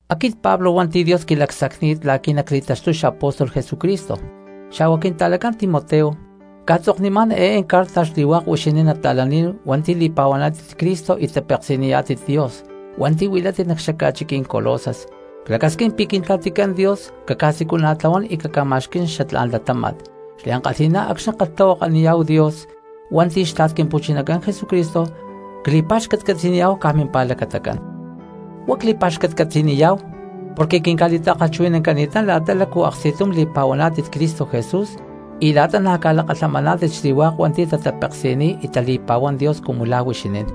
Aquit Pablo hua̠nti̠ Dios quilacsacni̠t la̠qui̠ nacli̠taxtuy xapóstol Jesucristo, xa̠hua quinta̠lacán Timoteo, cca̠tzoknimá̠n eé carta xli̠hua̠k huixinín nata̠lán hua̠nti̠ li̠pa̠huaná̠tit Cristo y tapeksi̠niyá̠tit Dios hua̠nti̠ huilátit nac xaca̠chiquí̠n Colosas. Clacasquín pi̠ Quintla̠ticán Dios caca̠siculana̠tlahuán y caca̠ma̠xquí̠n xatlá̠n latáma̠t. Xliankalhi̠ná acxni̠ ckalhtahuakaniyá̠hu Dios hua̠nti̠ xtla̠t Quimpu̠chinacán Jesucristo, cli̠pa̠xcatcatzi̠niyá̠hu caj mimpa̠lacatacán. Huá cli̠pa̠xcatcatzi̠niyá̠hu porque quinca̠li̠ta̠kalhchuhui̠nancani̠tán la̠ta lácu aksti̠tum li̠pa̠huaná̠tit Cristo Jesús y la̠ta na̠ ca̠lakalhamaná̠tit xli̠hua̠k hua̠nti̠ tatapeksi̠niy y tali̠pa̠huán Dios cumu la̠ huixinín.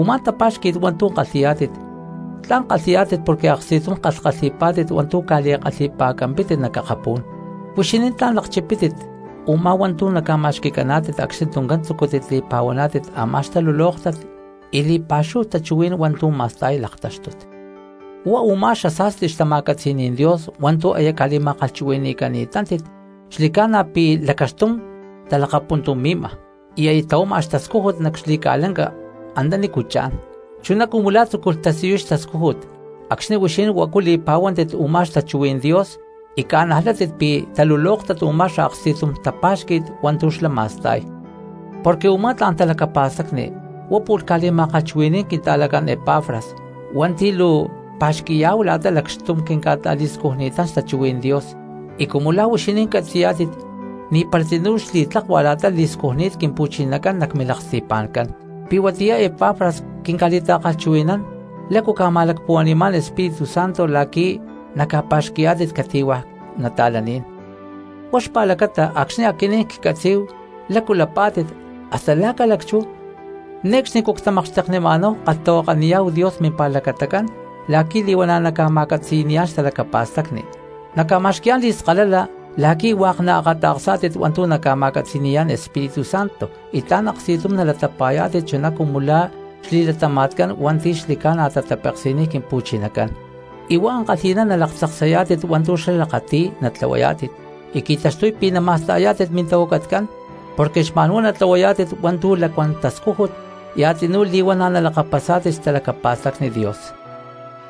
Umá tapa̠xqui̠t hua̠ntu̠ kalhi̠yá̠tit tla̠n kalhi̠yá̠tit porque aksti̠tum kalhkalhi̠pá̠tit hua̠ntu̠ ca̠li̠kalhi̠pa̠campítit nac akapú̠n. Huixinín tla̠n lakchipítit u̠má hua̠ntu̠ naca̠ma̠xqui̠caná̠tit acxni tuncán tzucútit li̠pa̠huaná̠tit a̠má xtalulóktat y li̠pa̠xúhu tachuhuí̠n hua̠ntu̠ ma̠sta̠y laktáxtut. Huá u̠má xasa̠sti xtama̠catzi̠ní̠n Dios hua̠ntu̠ aya ca̠li̠ma̠kalhchuhui̠ni̠cani̠tátit xli̠ca̠na pi̠ lacaxtum talakapuntumi̠ma y aya tlahuama xtascújut nac xli̠ca̠lanca antanícu cha̠n, chuná cumu la̠ tzúculh tasiyuy xtascújut acxni̠ huixinín huacu li̠pa̠huántit u̠má xtachuhuí̠n Dios y ca̠najlátit pi̠ talulóktat u̠má xaaksti̠tum tapa̠xqui̠t hua̠ntu̠ xlá ma̠sta̠y. Porque u̠má tla̠n talacapa̠stacni huá pu̠lh ca̠li̠ma̠kalhchuhui̠ní̠n quinta̠lacán Epafras hua̠nti̠ luu cpa̠xqui̠yá̠hu la̠ta lacxtum quinca̠ta̠li̠scujni̠tán xtachuhuí̠n Dios, y cumu la̠ huixinín catzi̠yá̠tit ni̠para tzinú xli̠tlakua la̠ta li̠scujni̠t Quimpu̠chinacán nac milaksti̠pa̠ncán. Pi̠ huatiyá Epafras quinca̠li̠ta̠kalhchuhui̠nán lácu ca̠ma̠lacpuhua̠ni̠má̠n Espíritu Santo la̠qui̠ naca̠pa̠xqui̠yá̠tit cati̠hua̠ cristianos. Huá xpa̠lacata acxni̠ aquinín ccatzí̠hu lácu lapá̠tit hasta la̠ ca̠lacchú ne̠cxnicú ctimakxteknima̠náhu kalhtahuakaniyá̠hu Dios mimpa̠lacatacán la̠qui̠ li̠huana̠ naca̠ma̠catzi̠ni̠yá̠n xtalacapa̠stacni, naca̠ma̠xqui̠yá̠n li̠skalala la̠qui̠ hua̠k naakata̠ksá̠tit hua̠ntu̠ naca̠ma̠catzi̠ni̠yá̠n Espíritu Santo, y tla̠n aksti̠tum nalatapa̠yá̠tit chuná cumu la̠ xli̠latama̠tcán hua̠nti̠ xli̠ca̠na tatapeksi̠niy Quimpu̠chinacán, y huá ankalhi̠ná nalaktzaksayá̠tit hua̠ntu̠ xlá lakati̠y natlahuayá̠tit, y qui̠taxtuy pi̠ nama̠sta̠yá̠tit mintahuacatcán porque xma̠nhuá natlahuayá̠tit hua̠ntu̠ lacuán tascújut y a̠tzinú li̠huana̠ nalakapasá̠tit xtalacapa̠stacni Dios.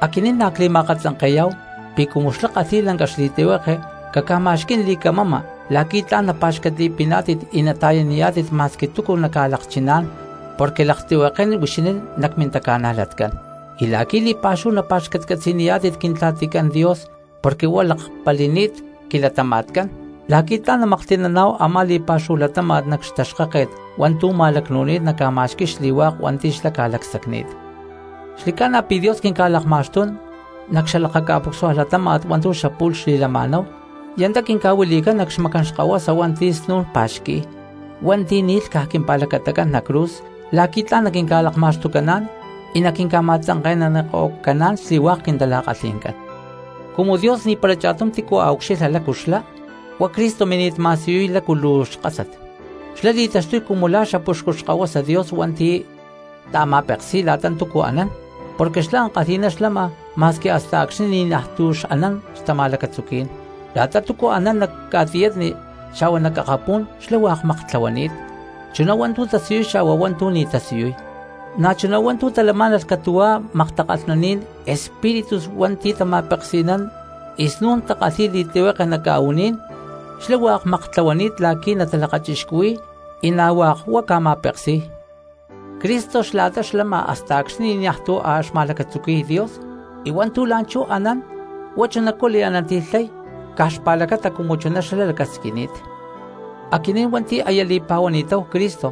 Aquinín na̠ cli̠ma̠akatzanke̠yá̠hu pi̠ cumu xlá kalhi̠y lanca xli̠tlihueke caca̠ma̠xquí̠n li̠camama la̠qui̠ tla̠n napa̠xcatli̠piná̠tit y nata̠yaniyá̠tit ma̠squi túcu naca̠lakchiná̠n porque laktlihuekén huixinín nac mintaca̠najlatcán, y la̠qui̠ li̠pa̠xúhu napa̠xcatcatzi̠niyá̠tit Quintla̠ticán Dios porque huá lakpali̠ni̠t quilatama̠tcán la̠qui̠ tla̠n namaklhti̠naná̠hu a̠má li̠pa̠xúhu latáma̠t nac xtaxkáket hua̠ntu̠ ca̠ma̠lacnu̠nini̠t naca̠ma̠xqui̠y xli̠hua̠k hua̠nti̠ xlá ca̠lacsacni̠t. Xli̠ca̠na pi̠ Dios quinca̠lakma̠xtún nac xalakaca̠pucsua latáma̠t hua̠ntu̠ xapu̠lh xli̠lama̠náhu y antá quinca̠huilí̠n nac xmacán xkahuasa hua̠nti̠ snu̠n pa̠xqui̠y, hua̠nti̠ ni̠lh caj quimpa̠lacatacán nac cruz la̠qui̠ tla̠n naquinca̠lakma̠xtucaná̠n y naquinca̠ma̠tzanke̠naniko̠caán xli̠hua̠k quintala̠kalhi̠ncán. Cumu Dios ni̠para cha̠tum tícu a̠ ucxilha lácu xlá, huá Cristo mini̠t ma̠siyuy lácu luu xkásat. Xlá li̠taxtuy cumu la̠ xapuxcu Xkahuasa Dios hua̠nti̠ ta̠ma̠peksi̠y la̠ta túcu anán porque xlá ankalhi̠ná xlama ma̠squi hasta acxni̠ ni̠najtu̠ xanán xtama̠lacatzuquí̠n. La̠ta túcu anán nac ca̠tiyatni xa̠hua nac akapú̠n xlá hua̠k maktlahuani̠t, chuná hua̠ntu̠ tasiyuy xa̠hua hua̠ntu̠ ni̠ tasiyuy, na̠chuná hua̠ntu̠ talamá̠nalh catu̠hua̠ maktakalhnaní̠n espíritus hua̠nti̠ tama̠peksi̠nán y snún takalhi̠y li̠tlihueke nac ca̠u̠ní̠n; xlá hua̠k maktlahuani̠t la̠qui̠ natalakachixcuhui̠y y na̠ hua̠k huá ca̠ma̠peksi̠y. Cristo xla̠ta xlama hasta acxni̠ ni̠najtu̠ a̠ xma̠lacatzuqui̠y Dios, y hua̠ntu̠ la̠nchú anán huá chunacú liananti̠lhay caj xpa̠lacata cumu chuná xlá lacasquini̠t. Aquinín hua̠nti̠ aya li̠pa̠huani̠táhu Cristo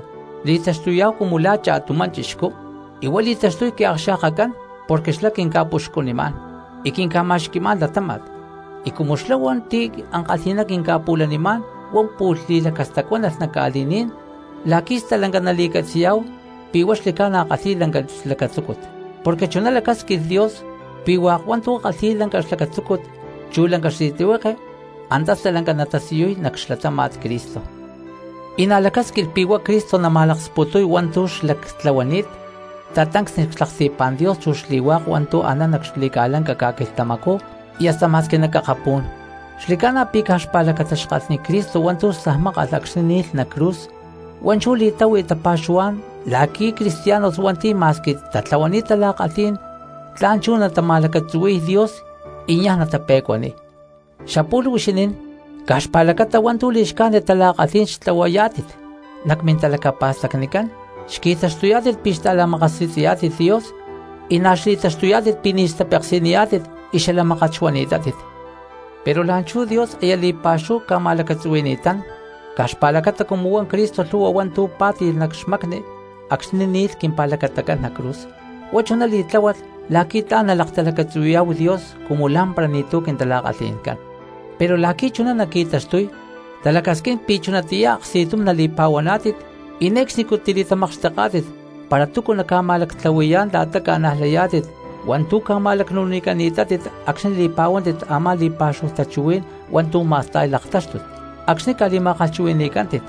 li̠taxtuyá̠hu cumu la̠ cha̠tumá cristiano y huá li̠taxtuy quiakxa̠kacán porque xlá quinca̠puxcunimá̠n y quinca̠ma̠xqui̠má̠n latáma̠t. Y cumu xlá hua̠nti̠ ankalhi̠ná quinca̠pu̠lanimá̠n huá pu̠lh li̠lacastacuánalh nac ca̠li̠ní̠n la̠qui̠ stalanca nali̠catzi̠yá̠hu pi̠ huá xli̠ca̠na kalhi̠y lanca xlacatzúcut. Porque chuná lacásquilh Dios pi̠ hua̠k hua̠ntu̠ kalhi̠y lanca xlacatzúcut chu lanca xli̠tlihueke, antá stalanca natasiyuy nac xlatáma̠t Cristo. Y na̠ lacásquilh pi̠ huá Cristo nama̠laksputuy hua̠ntu̠ xlactlahuani̠t tatancsni cxlaksti̠pá̠n Dios chu xli̠hua̠k hua̠ntu̠ anán nac xli̠ca̠lanca ca̠quilhtamacú y hasta ma̠squi nac akapú̠n. Xli̠ca̠na pi̠ caj xpa̠lacata xkalhni Cristo hua̠ntu̠ stajmákalh acxni̠ ni̠lh nac cruz huá chú li̠táhui tapa̠xuhuá̠n la̠qui̠ cristianos hua̠nti̠ ma̠squi tatlahuani̠t tala̠kalhí̠n tla̠n chú natama̠lacatzuhui̠y Dios y niaj natape̠cuaniy. Xapu̠lh, huixinín caj xpa̠lacata hua̠ntu̠ li̠xcájnit tala̠kalhí̠n xtlahuayá̠tit, nac mintalacapa̠stacnicán xqui̠taxtuyá̠tit pi̠ xta̠la̠makasi̠tzi̠yá̠tit Dios y na̠ xli̠taxtuyá̠tit pi̠ ni̠ xtapeksi̠niyá̠tit y xala mákat xuani̠tátit. Pero la̠nchú Dios aya li̠pa̠xúhu ca̠ma̠lacatzuhui̠ni̠tán caj xpa̠lacata cumu huá Cristo lhu̠hua hua̠ntu̠ pá̠ti̠lh nac xmacni acxni̠ ni̠lh quimpa̠lacatacán nac cruz. Huá chuná li̠tláhualh la̠qui̠ tla̠n nalaktalacatzuhui̠yá̠hu Dios cumu lá̠mpara ni̠tu̠ quintala̠kalhi̠ncán. Pero la̠qui̠ chuná naqui̠taxtuy talacasquín pi̠ chunatiyá aksti̠tum nali̠pa̠huaná̠tit y ne̠cxni tili̠tamakxteká̠tit para túcu naca̠ma̠lactlahui̠yá̠n la̠ta ca̠najlayá̠tit hua̠ntu̠ ca̠ma̠lacnu̠nicani̠tátit acxni̠ li̠pa̠huántit a̠má li̠pa̠xúhu tachuhuí̠n hua̠ntu̠ ma̠sta̠y laktáxtut acxni̠ ca̠li̠ma̠kalhchuhui̠ni̠cántit.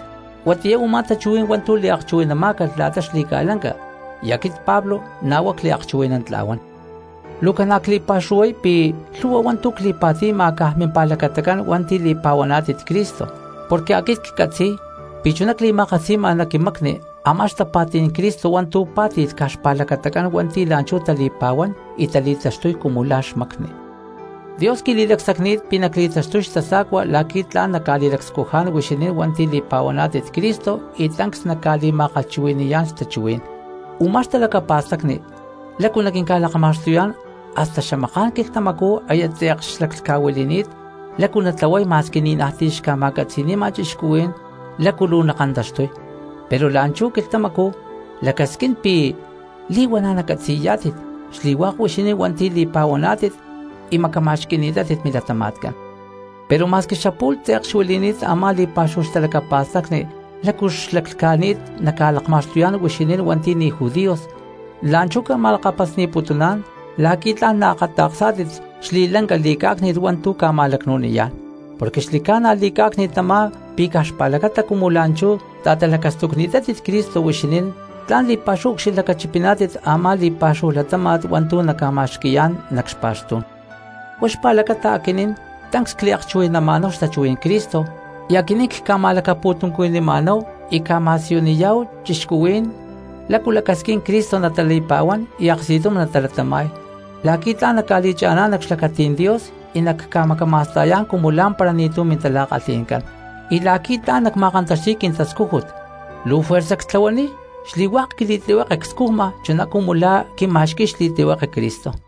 Huatiyá u̠má tachuhuí̠n hua̠ntu̠ liakchuhui̠namá̠calh la̠ta xli̠ca̠lanca, y aquit Pablo na̠ huá cliakchuhui̠nantla̠huán. Luu ca̠na cli̠pa̠xuhuay pi̠ lhu̠hua hua̠ntu̠ cli̠pa̠ti̠ma caj mimpa̠lacatacán hua̠nti̠ li̠pa̠huaná̠tit Cristo, porque aquit ccatzi̠y pi̠ chuná cli̠ma̠katzi̠ma nac quimacni a̠má xtapa̠tí̠n Cristo hua̠ntu̠ pá̠tilh caj xpa̠lacatacán hua̠nti̠ la̠nchú tali̠pa̠huán y tali̠taxtuy cumu la̠ xmacni. Dios quili̠lacsacni̠t pi̠ nacli̠taxtuy xtasa̠cua la̠qui̠ tla̠n nacca̠li̠scujá̠n huixinín hua̠nti̠ li̠pa̠huaná̠tit Cristo y tancs nacca̠li̠ma̠kalhchuhui̠ni̠yá̠n xtachuhuí̠n. Umá xtalacapa̠stacni lácu naquinca̠lakma̠xtuyá̠n hasta xamaká̠n quilhtamacú aya tze̠k xlaclhca̠huili̠ni̠t lácu natlahuay ma̠squi ni̠najti̠ xca̠ma̠catzi̠ni̠ma cristianos lácu luu nakantaxtuy, pero la̠nchú quilhtamacú lacasquín pi̠ li̠huana̠ nacatzi̠yá̠tit xli̠hua̠k huixinín hua̠nti̠ li̠pa̠huaná̠tit y macama̠xquí̠tit milatama̠tcán. Pero ma̠squi xapu̠lh tze̠k xuili̠ni̠t a̠má li̠pa̠xúhu xtalacapa̠stacni lácu xlaclhca̠ni̠t naca̠lakma̠xtuyá̠n huixinín hua̠nti̠ ni̠ judíos, la̠nchú ca̠ma̠lakapasni̠putuná̠n la̠qui̠ tla̠n naakata̠ksá̠tit xli̠lanca li̠cá̠cni̠t hua̠ntu̠ ca̠ma̠lacnu̠niyá̠n. Porque xli̠ca̠na li̠cá̠cni̠t tamá pi̠ caj xpa̠lacata cumu la̠nchú ta̠talacastucni̠tátit Cristo huixinín tla̠n li̠pa̠xúhu ucxilhlacachipiná̠tit a̠má li̠pa̠xúhu latáma̠t hua̠ntu̠ naca̠ma̠xqui̠ya̠chá̠n nac xpa̠xtú̠n. Huá xpa̠lacata aquinín tancs cliakchuhui̠nama̠náhu xtachuhuí̠n Cristo y aquinín cca̠ma̠lacapu̠tuncuhui̠ni̠ma̠náhu cca̠ma̠siyuniyá̠hu cristianos lácu lacasquín Cristo natali̠pa̠huán y aksti̠tum natalatama̠y, la̠qui̠ tla̠n nacca̠li̠cha̠ná̠n nac xlacatí̠n Dios y nacca̠macama̠sta̠yá̠n cumu lá̠mpara ni̠tu̠ mintala̠kalhi̠ncán. Y la̠qui̠ tla̠n nacma̠kantaxti̠y quintascújut luu fuerza cli̠tlahuaniy xli̠hua̠k quili̠tlihueke cscujma chuná cumu la̠ quima̠xqui̠y xli̠tlihueke Cristo.